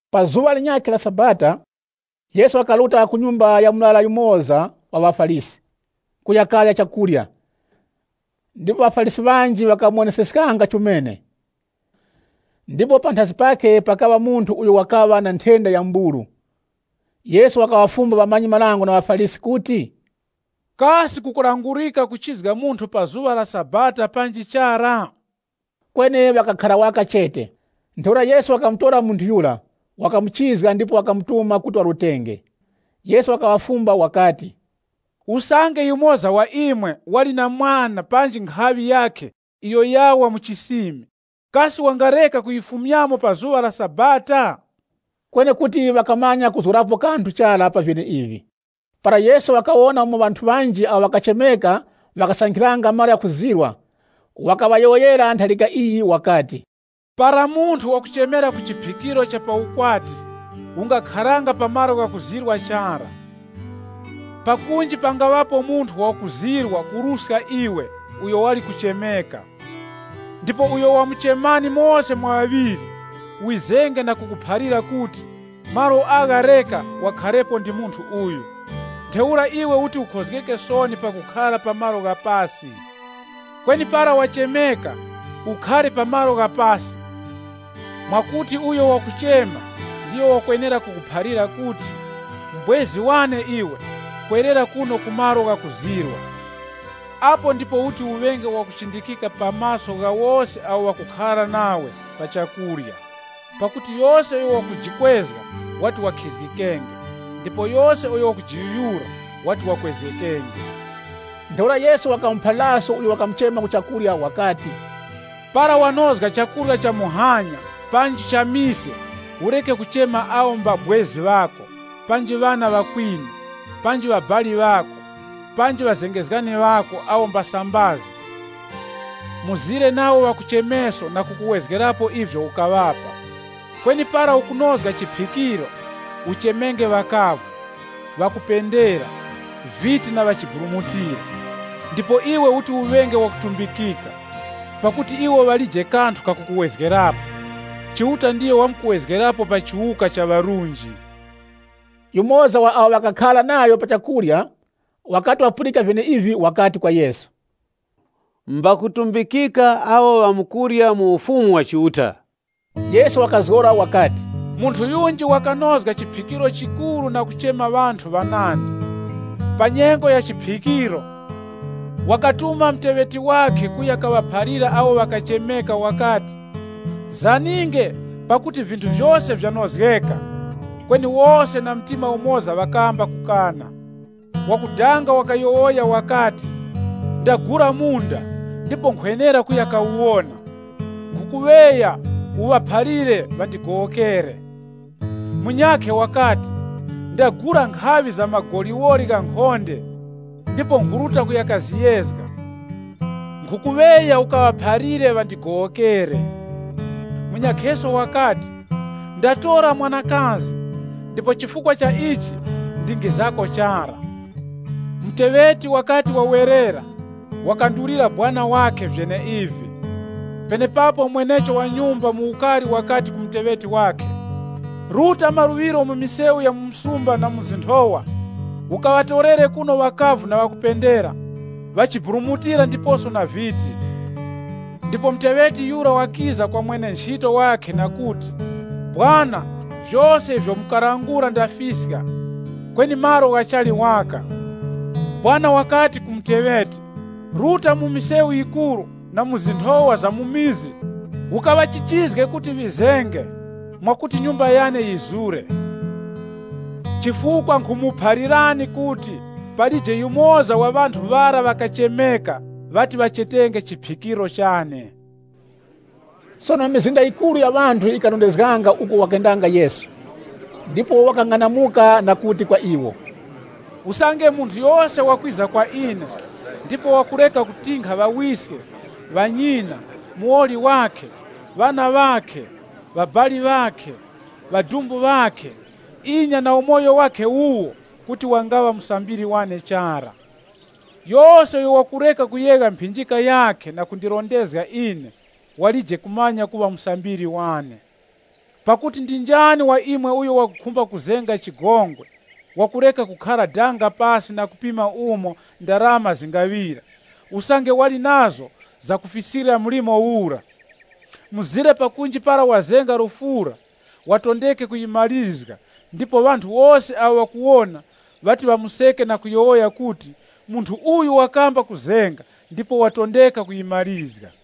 Pa zuŵa linyakhe la Sabata Yesu wakaruta ku nyumba ya murara yumoza wa ŵaFarisi, kuya karya, ndipo ŵaFarisi ŵanji ŵakamuwoneseskanga chomene. Ndipo panthazi pakhe pakaŵa munthu uyo wakaŵa na nthenda ya mburu. Yesu wakaŵafumba ŵamanyi-marango na ŵaFarisi kuti, “Kasi kukulangurika kuchizga munthu pa zuŵa la Sabata panji chara?” Kweni ŵakakhara waka chete. Ntheura Yesu wakamutora munthu yura, wakamuchizga ndipo wakamutuma kuti warutenge. Yesu wakaŵafumba wakati, “Usange yumoza wa imwe wali na mwana panji nkhaŵi yakhe iyo yawa mu chisimi, kasi wangareka kuyifumyamo pa zuŵa la Sabata?” Kweni kuti ŵakamanya kuzgorapo kanthu chara pa vyeneivi. Para Yesu wakawona umo ŵanthu ŵanji awo ŵakachemeka ŵakasankhiranga malo ghakuzirwa, wakaŵayowoyera ntharika iyi wakati, “Para munthu wakuchemera ku chiphikiro cha pa nthengwa, ungakharanga pa malo ghakuzirwa chara. Pakunji pangaŵapo munthu wakuzirwa kuruska iwe uyo wali kuchemeka. Ndipo uyo wamuchemani mose mwa ŵaŵiri, wizenge na kukuphalira kuti, ‘Malo agha reka wakharepo ndi munthu uyu.’ Ntheura iwe uti ukhozgeke soni pakukhara pa malo gha pasi. Kweni para wachemeka, ukakhare pa malo gha pasi, mwakuti uyo wakuchema ndiyo wakwenera kukuphalira kuti, ‘M'bwezi wane iwe, kwerera kuno ku malo ghakuzirwa.’ Apo ndipo uti uŵenge wakuchindikika pa maso gha wose awo ŵakukhara nawe pa chakurya. Pakuti yose uyo wakujikwezga, wati wakhizgikenge ndipo yose uyo wakujiyuyura, wati wakwezgekenge.” Ntheura Yesu wakamuphaliraso uyo wakamuchema ku chakurya wakati, “Para wanozga chakurya cha muhanya panji cha mise, ureke kuchema awo mbabwezi ŵako, panji ŵana ŵakwinu, panji ŵabali ŵako, panji ŵazengezgani ŵako awo mbasambazi, mzire nawo v na kukuwezgerapo ivyo ukaŵapa. Kweni para ukunozga chiphikiro, uchemenge ŵakavu, ŵakupunduka, viti na ŵachiburumutira. Ndipo iwe uti uŵenge wakutumbikika, pakuti iwo ŵalije kanthu kakukuwezgerapo. Chiuta ndiyo wamkukuwezgerapo pa chiwuka cha ŵarunji.” Yumoza wa awo ŵakakhara nayo pa chakurya wakati wapulika vyeneivi, wakati kwa Yesu, “Mbakutumbikika awo ŵamkurya mu Ufumu wa Chiuta.” Yesu wakazgora wakati, “Munthu yunji wakanozga chiphikiro chikuru na kuchema ŵanthu ŵanandi. Pa nyengo ya chiphikiro, wakatuma muteŵeti wakhe kuya kaŵaphalira awo ŵakachemeka, wakati, ‘Zaninge, pakuti vinthu vyose vyanozgeka.’ Kweni wose na mtima umoza ŵakamba kukana. Wakudanga wakayowoya wakati, ‘Ndagula munda ndipo nkhwenera kuya kawuwona. Nkhukuŵeya, ukaŵaphalire ŵandigowokere.’ Munyakhe wakati, ‘Ndagula nkhaŵi za magoliwoli ghankhonde, ndipo nkhuruta ku kaziyezga, nkhukuŵeya ukaŵaphalire ŵandigowokere.’ Munyakheso wakati, ‘Ndatora mwanakazi, ndipo chifukwa cha ichi ndingizako chara.’ “Muteŵeti wakati wawera, wakamwandulira mwene-nchito wakhe vyeneivi. Penepapo mwenecho wa nyumba mu ukari wakati ku muteŵeti wakhe, ‘Ruta maluŵiro mu misewu ya mu msumba na mu zinthowa ukaŵatorere kuno ŵakavu na ŵakupendera, ŵachiburumutira ndiposo na viti.’ Ndipo muteŵeti yura wakiza kwa mwene-nchito wakhe na kuti, ‘Sekuru, vyose ivyo mukalangula ndafiska, kweni malo ghachali waka.’ Mwene-nchito wakati ku muteŵeti, ‘Ruta mu misewu yikuru na mu zinthowa za mu mizi ukaŵachichizge kuti ŵizenge, mwakuti nyumba yane yizure. Chifukwa nkhumuphalirani kuti palije yumoza wa ŵanthu ŵara ŵakachemeka ŵati ŵachetenge chiphikiro chane.’” Sono mizinda yikuru ya ŵanthu yikarondezganga uko wakendanga Yesu, ndipo wakang'anamuka na kuti kwa iwo, “Usange munthu yose wakwiza kwa ine, ndipo wakureka kutinkha ŵawiske, ŵanyina, muwoli wakhe, ŵana ŵakhe, ŵabali ŵakhe, ŵadumbu ŵakhe, inya na umoyo wakhe wuwo kuti wangaŵa musambiri wane chara. Yose uyo wakureka kuyegha mphinjika yakhe na kundirondezga ine, walije kumanya kuŵa musambiri wane. “Pakuti ndi njani wa imwe uyo wakukhumba kuzenga chigongwe, wakureka kukhara danga pasi na kupima umo ndarama zingaŵira, usange wali nazo zakufiskira mlimo ura? Mzire pakunji para ŵazenga lufura, ŵatondeke kuyimarizga ndipo ŵanthu wose awo ŵakuwona ŵati ŵamuseke na kuyowoya kuti, ‘Munthu uyu wakamba kuzenga ndipo watondeka kuyimarizga.’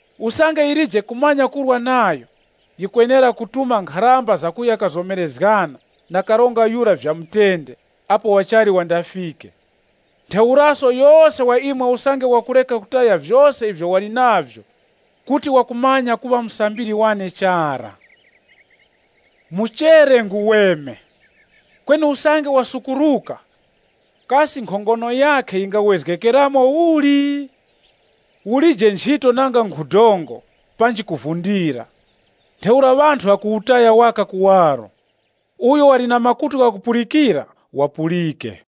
Usange yilije kumanya kurwa nayo, yikwenera kutuma nkharamba za kuya kazomerezgana na karonga yura vya mutende apo wachali wandafike. Ntheuraso yose wa imwe usange wakureka kutaya vyose ivyo wali navyo, kuti wakumanya kuŵa musambiri wane chara. “Muchere nguweme. Kweni usange wasukuruka, kasi nkhongono yakhe yingawezgekeramo uli? Ulije nchito nanga nkhu dongo panji ku chizara. Ntheura ŵanthu ŵakuwutaya waka kuwaro. Uyo wali na makutu ghakupulikira, wapulike.”